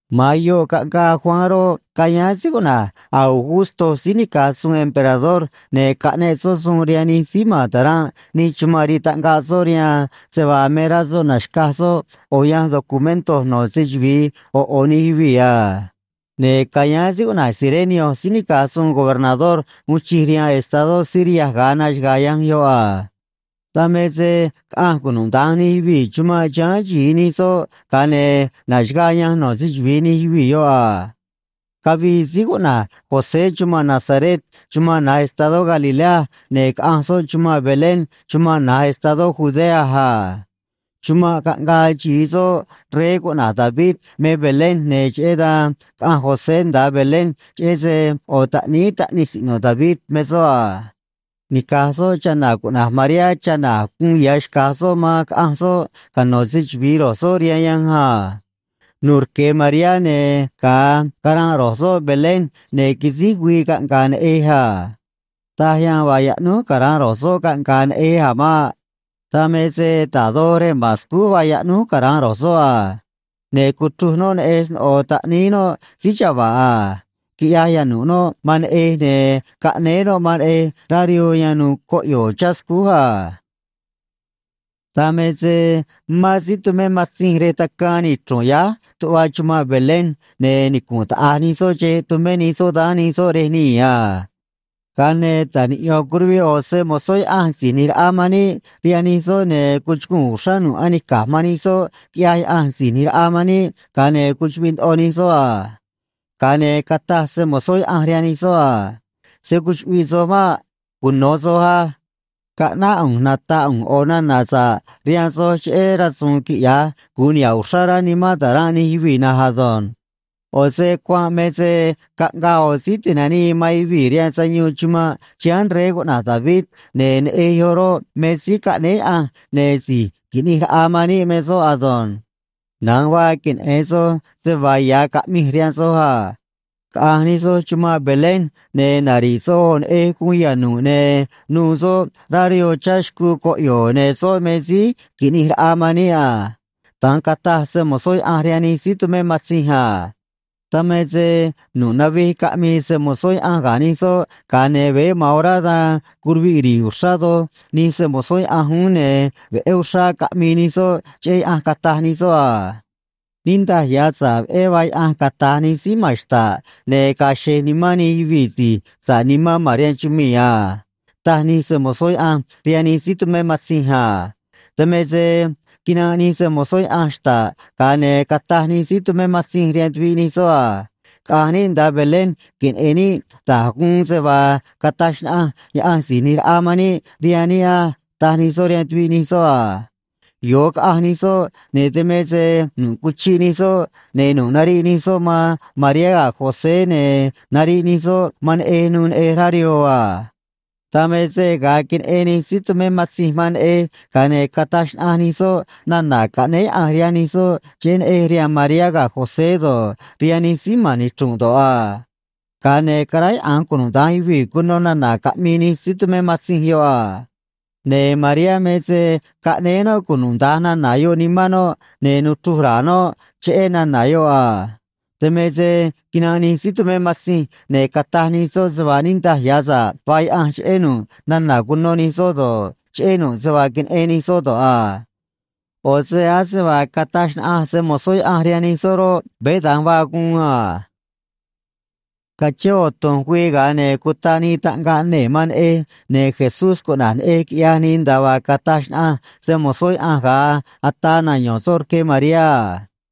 Ma̱an yoꞌ caꞌngaa Juan roꞌ, cayáán síí cuꞌna̱j Augusto síí nica̱j suun emperador, ne̱ caꞌneꞌ soꞌ suun rihaan nij síí ma̱n ta̱ranꞌ nij chumanꞌ rii taꞌngaꞌ soꞌ rihaan se vaa me rá soꞌ na̱xcaj soꞌ ꞌo̱ yanj documento no̱ se‑chuvi̱i ꞌo̱ ꞌo̱ nij yuvii̱ a. Ne̱ cayáán síí cuꞌna̱j Cirenio síí nica̱j suun gobernador uun chij rihaan estadó Siria ga̱a naxaga̱a̱ yanj yoꞌ a. Dan me se caꞌanj cunuda̱nj nij yuvii̱ chumanꞌ chiháán xi̱i nij soꞌ, ga̱a ne̱ naxaga̱a̱ yanj no̱ se‑chuvi̱i nij yuvii̱ yoꞌ a. Cavii síí cuꞌna̱j José chumanꞌ Nazaret chumanꞌ na̱j estadó Galilea, ne̱ caꞌanj soꞌ chumanꞌ Belén chumanꞌ na̱j estadó Judea a. Chumanꞌ caꞌngaa xi̱i soꞌ rey cuꞌna̱j David me Belén, ne̱ cheꞌé dan caꞌanj José nda̱a Belén, cheꞌé se ꞌo̱ taꞌníí taꞌnij siꞌno̱ David me soꞌ a. Nica̱j soꞌ chana̱ cuꞌna̱j Mariá chana̱ a̱j guun ya̱ xca̱j soꞌ man, caꞌanj soꞌ cano̱ se‑chuvi̱i ro̱j soꞌ rihaan yanj a. Nu̱u̱ rque Mariá, ne̱ ga̱a caranꞌ ro̱j soꞌ Belén, ne̱ quisíj güii caꞌnga̱a̱ neꞌej a. Taj yan vaa yaꞌnúj cara̱nꞌ ro̱j soꞌ caꞌnga̱a̱ neꞌej a̱ maꞌ. Dan me se da̱j doj rej ma̱n scúj vaa yaꞌnúj cara̱nꞌ ro̱j soꞌ a. Ne̱ cuchruj noꞌ neꞌej sno̱ꞌo taꞌníí noꞌ síí chava̱ꞌ a. Quiꞌyaj yanu̱ꞌ noꞌ man neꞌej, ne̱ caꞌnéé noꞌ man neꞌej rá rihoo yan nu̱u̱ coꞌyo̱o̱ chá scúj a. Dan me se mán síí tumé matzinj rej tacaan nichru̱nꞌ yáj tuꞌva chumanꞌ Belén, ne̱ nicunꞌ taꞌa̱j nij soꞌ xeꞌ tumé nij soꞌ daán nij soꞌ rej nii̱ a. Ga̱a ne̱ ta̱j niꞌyo̱n curuviꞌ ꞌo̱ se‑mo̱zó Yaꞌanj Si̱j ꞌNi̱j Raꞌa man níꞌ rihaan nij soꞌ, ne̱ cuchuguu̱n uxrá nu̱ꞌ anica̱j man nij soꞌ, quiꞌyaj Yaꞌanj Si̱j ꞌNi̱j Raꞌa man níꞌ, ga̱a ne̱ cuchuꞌviꞌ ndoꞌo nij soꞌ a. Ga̱a ne̱ cataj se‑mo̱zó Yaꞌanj rihaan nij soꞌ a: ―Se̱ cuchuꞌviꞌ soj maꞌ. Cuno̱ soj á. Caꞌnáꞌ ꞌu̱nj nata̱ꞌ ꞌu̱nj ꞌo̱ nana̱ sa̱ꞌ rihaan soj cheꞌé rasu̱u̱n quiꞌya̱j gu̱un niha̱ꞌ uxrá rá nimán ta̱ranꞌ nij yuvii̱ na̱nj ado̱nj. ꞌO̱ se cuanꞌ me se caꞌngaa ꞌo̱ Síí Ti̱nanii man Yuvii̱ rihaan Sayuun chumanꞌ chiháán rey cuꞌna̱j David, ne̱ neꞌej yoꞌ roꞌ, me Síí Caꞌnéé Yaꞌanj, ne̱ Si̱j Qui̱ꞌnij Raꞌa man níꞌ me soꞌ ado̱nj. Na̱nj vaa queneꞌe̱n soj se vaa ya̱ caꞌmij rihaan soj a. Caꞌa̱nj nij soj chumanꞌ Belén, ne̱ nari̱ꞌ soj ꞌo̱ neꞌej guun yanu̱ꞌ, ne̱ nu̱u̱ soꞌ rá rihoo chá xcuu coꞌyo̱o̱, ne̱ soꞌ me Síí Qui̱ꞌnij Raꞌa man níꞌ a ―da̱nj cataj se‑mo̱zó Yaꞌanj rihaan nij síí tumé matzinj a. Dan me se nu̱ꞌ navij caꞌmii se‑mo̱zó Yaꞌanj ga̱ nij soꞌ, ga̱a ne̱ veé ma̱an orá dan curuviꞌ ri̱i̱ uxrá doj nij se‑mo̱zó Yaꞌanj uún, ne̱ veꞌé uxrá caꞌmii nij soꞌ cheꞌé Yaꞌanj, cataj nij soꞌ a: Niꞌndaj ya̱ sa̱ꞌ veꞌé vaa Yaꞌanj, cata̱j nij síí ma̱n xta̱ꞌ, ne̱ ga̱a̱ xe̱j nimán nij yuvii̱ si̱j sa̱ꞌ nimán ma̱n rihaan chumii̱ a, taj nij se‑mo̱zó Yaꞌanj rihaan nij síí tumé matzinj a. Dan me se quinanꞌ nij se‑mo̱zó Yaꞌanj xta̱ꞌ, ga̱a ne̱ cataj nij síí tumé matzinj rihaan tuviꞌ nij soꞌ a: ―Caꞌa̱nj níꞌ nda̱a Belén queneꞌe̱n níꞌ da̱j guun se vaa cataj xnaꞌanj Yaꞌanj Si̱j ꞌNi̱j Raꞌa man níꞌ rihaan níꞌ á ―taj nij soꞌ rihaan tuviꞌ nij soꞌ a. Yo̱o caꞌanj nij soꞌ, ne̱ dan me se nu̱ꞌ cuchiꞌ nij soꞌ, ne̱ nu̱ꞌ nariꞌ nij soꞌ man Mariá ga̱ José, ne̱ nariꞌ nij soꞌ man neꞌej, nu̱u̱ neꞌej rá rihoo a. Dan me se ga̱a queneꞌen nij síí tumé matzinj man neꞌej, ga̱a ne̱ cataj xnaꞌanj nij soꞌ nana̱ caꞌnéé Yaꞌanj rihaan nij soꞌ cheꞌé neꞌej rihaan Mariá ga̱ José do̱ꞌ, rihaan nij síí ma̱n nichru̱nꞌ do̱ꞌ a. Ga̱a ne̱ caráyaꞌa̱nj cunuda̱nj yuvii̱ cuno nana̱ caꞌmii nij síí tumé matzinj yoꞌ a. Ne̱ Mariá me se caꞌnéé noꞌ cunuda̱nj nana̱ yoꞌ nimán noꞌ, ne̱ nuchruj ra̱a̱ noꞌ cheꞌé nana̱ yoꞌ a. Dan me se quinanꞌ nij síí tumé matzinj, ne̱ cataj nij soꞌ se vaa niꞌndaj ya̱ sa̱ꞌ vaa Yaꞌanj cheꞌé nu̱ꞌ nana̱ cuno nij soꞌ do̱ꞌ, cheꞌé nu̱ꞌ se vaa queneꞌen nij soꞌ do̱ꞌ a. ꞌO̱ se ase vaa cataj xnaꞌanj se‑mo̱zó Yaꞌanj rihaan nij soꞌ roꞌ, veé da̱nj vaa guun a. Cachén ꞌo̱ tu̱nj güii ga̱a ne̱ cutaꞌ nii taꞌngaꞌ nee̱ man neꞌej, ne̱ JESÚS cuꞌna̱j neꞌej, quiꞌyaj nii, nda̱a vaa cataj xnaꞌanj se‑mo̱zó Yaꞌanj ga̱a ataa nayo̱n soꞌ rque Mariá a.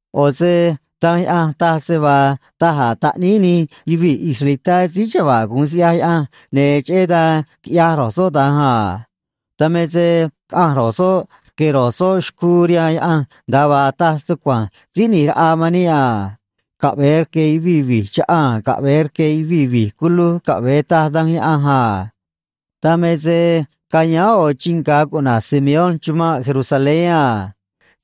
ꞌO̱ se Danj Yaꞌanj taj se vaa da̱j a̱ taꞌníí nij yuvii̱ israelitá síí chava̱ꞌ gu̱un siꞌyaj Yaꞌanj, ne̱ cheꞌé dan quiꞌyaj ro̱j soꞌ da̱nj a. Dan me se caꞌanj ro̱j soꞌ rque̱ ro̱j soꞌ xcuu rihaan Yaꞌanj nda̱a vaa taj stucua̱nj Síí ꞌNi̱j Raꞌa man níꞌ a. Caꞌve̱e rque̱ yuvii̱ vi̱j chaꞌaa̱n caꞌve̱e rque̱ yuvii̱ vi̱j culuj caꞌve̱e, taj Danj Yaꞌanj a. Dan me se cayáán ꞌo̱ chii nga̱ cuꞌna̱j Simeón chumanꞌ Jerusalén a.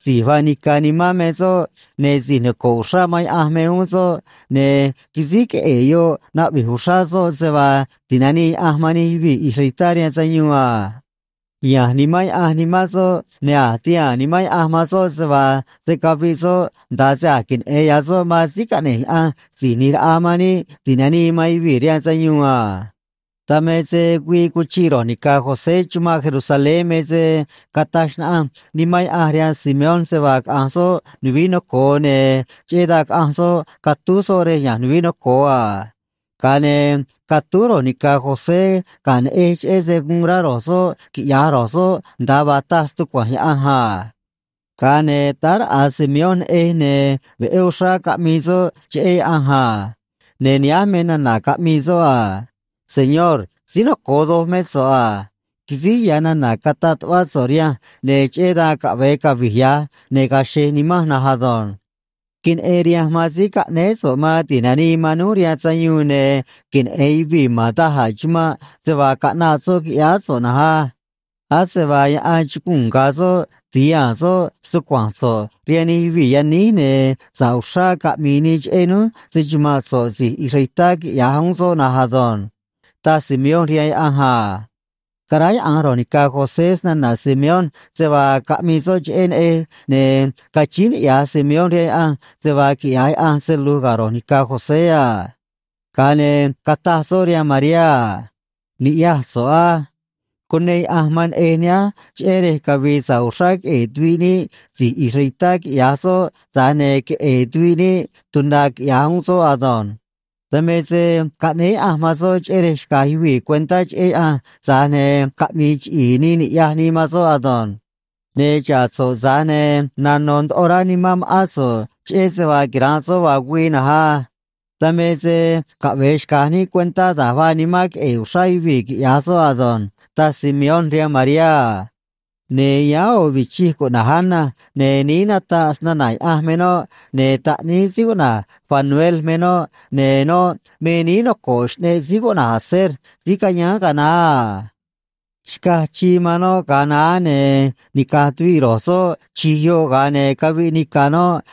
Si̱j vaa nica̱ nimán me soꞌ, ne̱ si̱j noco̱ꞌ uxrá man Yaꞌanj me uún soꞌ, ne̱ quisíj queꞌe̱e̱ yoꞌ naꞌvi̱j uxrá soꞌ se vaa ti̱nanii Yaꞌanj man nij yuvii̱ israelitá rihaan sayuun a. Ya̱nj Nimán Yaꞌanj nimán soꞌ, ne̱ a̱j tihaa̱n Nimán Yaꞌanj man soꞌ se vaa se̱ caviꞌ soꞌ nda̱a se a̱j queneꞌe̱n ya̱ soꞌ man Síí Caꞌne̱j Yaꞌanj Si̱j ꞌNi̱j Raꞌa man níꞌ Ti̱nanii man Yuvii̱ rihaan Sayuun a. Dan me se güii cuchiꞌ ro̱j ni̱ca̱ José chumanꞌ Jerusalén me se cataj xnaꞌanj Nimán Yaꞌanj rihaan Simeón se vaa caꞌa̱nj soꞌ nuvií noco̱o, ne̱ cheꞌé dan caꞌanj soꞌ catúj soꞌ rej ya̱nj nuvií noco̱o a. Ga̱a ne̱ catúj ro̱j ni̱ca̱ José ga̱ neꞌej cheꞌé se guun rá ro̱j soꞌ quiꞌya̱j ro̱j soꞌ nda̱a vaa taj stucua̱nj Yaꞌanj a. Ga̱a ne̱ táá raꞌa̱ Simeón neꞌej, ne̱ veꞌé uxrá caꞌmii soꞌ cheꞌé Yaꞌanj a. Ne̱ nihánj me nana̱ caꞌmii soꞌ a: Señor, síí noco̱o doj mé so̱ꞌ a. Quisíj ya̱ nana̱ cataꞌ tuꞌvá so̱ꞌ rihanj, ne̱ cheꞌé dan caꞌve̱e cavi̱j ya̱j, ne̱ ga̱a̱ xe̱j nimanj na̱nj ado̱nj. Queneꞌen rihanj man síí caꞌnéé so̱ꞌ man ti̱nanii man núj rihaan sayuun, ne̱ queneꞌe̱n yuvii̱ ma̱n da̱j a̱ chumanꞌ se vaa caꞌnaꞌ soꞌ quiꞌyáá so̱ꞌ na̱nj á. Ase vaa yaꞌan chuguu̱n ga̱a̱ soꞌ ti̱haa̱n soꞌ stucua̱nj so̱ꞌ rihaan nij yuvii̱ yaníj, ne̱ sa̱ꞌ uxrá caꞌmi̱i̱ nii cheꞌé núj, se‑chuma̱nꞌ so̱ꞌ si̱j israelitá, quiꞌya̱j uún soꞌ na̱nj ado̱nj, taj Simeón rihaan Yaꞌanj a. Caráyaꞌa̱nj ro̱j ni̱ca̱ José snana̱ Simeón se vaa caꞌmii soꞌ cheꞌé neꞌej, ne̱ cachíín niꞌya̱j Simeón rihaan Yaꞌanj se vaa quiꞌya̱j Yaꞌanj se lu̱j ga̱ ro̱j ni̱ca̱ José a. Ga̱a ne̱ cataj soꞌ rihaan Mariá a: ―Ni̱ꞌyaj so̱ꞌ á. Cuneꞌ Yaꞌanj man neꞌej nihánj cheꞌé rej cavi̱i̱ sa̱ꞌ uxrá queꞌe̱e̱ tuviꞌ níꞌ si̱j israelitá, quiꞌya̱j soꞌ, tza̱j ne̱ queꞌe̱e̱ tuviꞌ níꞌ tuna̱, quiꞌya̱j uún soꞌ ado̱nj. Dan me se caꞌnéé Yaꞌanj man soꞌ cheꞌé rej xca̱j yuvii̱ cuentá cheꞌé Yaꞌanj, tza̱j ne̱ caꞌmi̱i̱ chiꞌi̱i̱ nii ni̱ꞌyaj nii man soꞌ ado̱nj. Ne̱ xa̱ꞌ so̱ꞌ, tza̱j ne̱ nano̱ ndoꞌo rá nimán ma̱ꞌán so̱ꞌ cheꞌé se vaa quira̱nꞌ soꞌ vaa güii na̱nj á. Dan me se caꞌve̱e xca̱j níꞌ cuentá da̱j vaa nimán queꞌe̱e̱ uxrá yuvii̱, quiꞌya̱j soꞌ ado̱nj ―taj Simeón rihaan Mariá a. Ne̱ yáán ꞌo̱ vichij cuꞌna̱j Ana, ne̱ níí nataꞌ snana̱ Yaꞌanj me noꞌ, ne̱ taꞌníí síí cuꞌna̱j Fanuel me noꞌ, ne̱ noꞌ me níí noco̱ꞌ xꞌneꞌ síí cuꞌna̱j Aser síí cayáán ga̱a naá a. Xcaj chii man noꞌ ga̱a naá, ne̱ nica̱j tuviꞌ ro̱j soꞌ chi̱j yoꞌ, ga̱a ne̱ caviꞌ nica̱ noꞌ,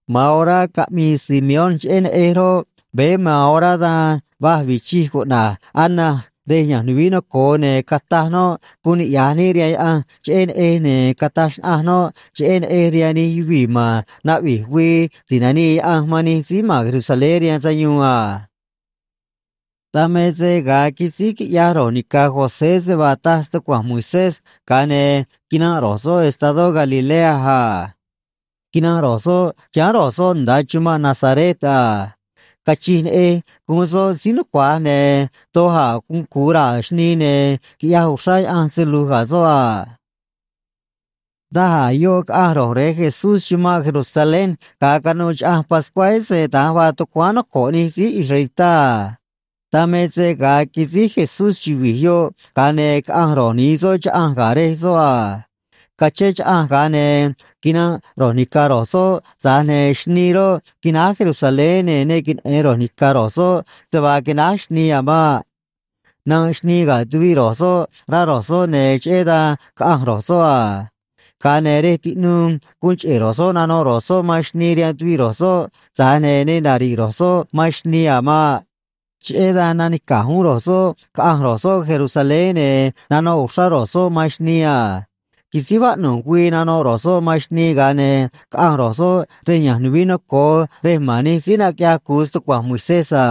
Ma̱an orá caꞌmii Simeón cheꞌé neꞌej roꞌ, veé ma̱an orá dan va̱j vichij cuꞌna̱j Ana rej ya̱nj nuvií noco̱o, ne̱ cataj noꞌ guun niꞌya̱j níꞌ rihaan Yaꞌanj cheꞌé neꞌej, ne̱ cataj xnaꞌanj noꞌ cheꞌé neꞌej rihaan nij yuvii̱ ma̱n naꞌvi̱j güii ti̱nanii Yaꞌanj man nij síí ma̱n Jerusalén rihaan sayuun a. Dan me se ga̱a quisíj quiꞌyaj ro̱j ni̱ca̱ José se vaa taj stucua̱nj Moisés, ga̱a ne̱ quinanꞌ ro̱j soꞌ estadó Galilea a. Quinanꞌ ro̱j soꞌ chiháán ro̱j soꞌ nda̱a chumanꞌ Nazaret a. Cachij neꞌej guun soꞌ síí nucua̱j, ne̱ doj a̱ guun cu̱u raa̱ xnii, ne̱ quiꞌyaj uxrá Yaꞌanj se lu̱j ga̱ soꞌ a. Daj a̱ yoꞌ caꞌanj ro̱j rej Jesús chumanꞌ Jerusalén ga̱a canuû Chaꞌanj Pascuá, ese da̱nj vaa tucuáán noco̱ꞌ nij síí israelitá a. Dan me se ga̱a quisíj Jesús chuvi̱j yoꞌ, ga̱a ne̱ caꞌanj ro̱j ni̱i soꞌ chaꞌanj ga̱ rej soꞌ a. Cachén chaꞌanj, ga̱a ne̱ quinanꞌ ro̱j ni̱ca̱ ro̱j soꞌ, tza̱j ne̱ xnii roꞌ, quináj Jerusalén, ne̱ ne queneꞌe̱n ro̱j ni̱ca̱ ro̱j soꞌ se vaa quináj xnii a̱ maꞌ. Nanꞌ xnii ga̱ tuviꞌ ro̱j soꞌ, rá ro̱j soꞌ, ne̱ cheꞌé dan caꞌanj ro̱j soꞌ a. Ga̱a ne̱ rej tiꞌnuu guun cheꞌe̱ ro̱j soꞌ nanoꞌ ro̱j soꞌ man xnii rihaan tuviꞌ ro̱j soꞌ, tza̱j ne̱ ne nari̱ꞌ ro̱j soꞌ man xnii a̱ maꞌ. Cheꞌé dan nanica̱j uún ro̱j soꞌ caꞌanj ro̱j soꞌ Jerusalén, ne̱ nanoꞌ uxrá ro̱j soꞌ man xnii a. Quisíj vaꞌnu̱j güii nanoꞌ ro̱j soꞌ man xnii, ga̱a ne̱ caꞌanj ro̱j soꞌ rej ya̱nj nuvií noco̱o rej ma̱n nij síí naquiꞌyaj cu̱u stucua̱nj Moisés a.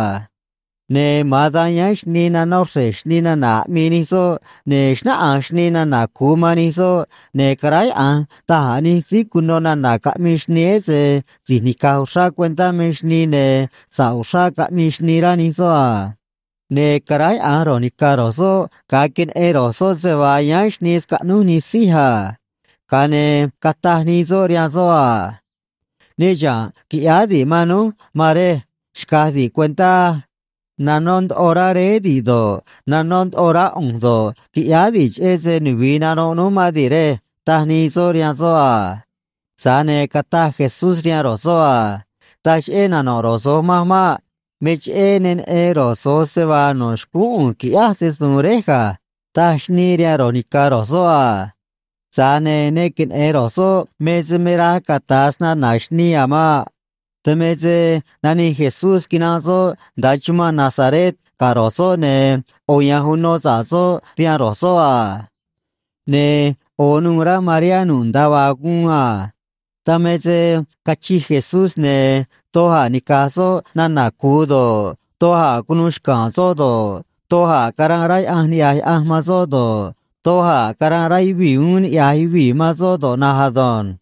Ne̱ ma̱an dan yáán xnii nanó xre̱j xnii nana̱ aꞌmii nij soꞌ, ne̱ xnáꞌanj xnii nana̱ cu̱u man nij soꞌ, ne̱ caráyaꞌa̱nj da̱j a̱ nij síí cuno nana̱ caꞌmii xnii, ese si̱j nica̱j uxrá cuentá me xnii, ne̱ sa̱ꞌ uxrá caꞌmii xnii, rá nij soꞌ a. Ne̱ caráyaꞌa̱nj ro̱j ni̱ca̱ ro̱j soꞌ ga̱a queneꞌen ro̱j soꞌ se vaa yáán xnii scaꞌnúj nij sij a. Ga̱a ne̱ cataj nii soꞌ rihaan soꞌ a: ―Ne chiha̱nꞌ quiꞌyáá di̱ꞌ man núj, maan rej. Xca̱j di̱ꞌ cuentá á. Nanó ndoꞌo rá réé di̱ꞌ do̱ꞌ, nanó ndoꞌo rá ꞌu̱nj do̱ꞌ, quiꞌyáá di̱ꞌ, cheꞌé se nuvi̱i nanoꞌ núj mán di̱ꞌ, rej ―taj nii soꞌ rihaan soꞌ a. Tza̱j ne̱ cataj Jesús rihaan ro̱j soꞌ a: ―Taj cheꞌé nano̱ꞌ ro̱j so̱j manj maꞌ. Me cheꞌé ne neꞌen ro̱j so̱j se vaa no̱ xcúún ꞌu̱nj qui̱ꞌyáj se‑su̱u̱n Réj ga̱ ―taj xnii rihaan ro̱j ni̱ca̱ ro̱j soꞌ a. Tza̱j ne̱ ne queneꞌe̱n ro̱j soꞌ me se me raj cata̱a snana̱ xnii a̱ maꞌ. Dan me se nanij Jesús quinanꞌ soꞌ nda̱a chumanꞌ Nazaret ga̱ ro̱j soꞌ, ne̱ ꞌo̱ ya̱nj uno sa̱ꞌ soꞌ rihaan ro̱j soꞌ a. Ne̱ ꞌo̱ nuû rá Mariá nu̱ꞌ nda̱a vaa guun a. Dan me se cachij Jesús, ne̱ doj a̱ nica̱j soꞌ nana̱ cu̱u do̱ꞌ, doj a̱ cunuu xca̱a̱n soꞌ do̱ꞌ, doj a̱ caranꞌ rá Yaꞌanj niꞌya̱j Yaꞌanj man soꞌ do̱ꞌ, doj a̱ caranꞌ rá yuvii̱ uún niꞌya̱j yuvii̱ man soꞌ do̱ꞌ na̱nj ado̱nj.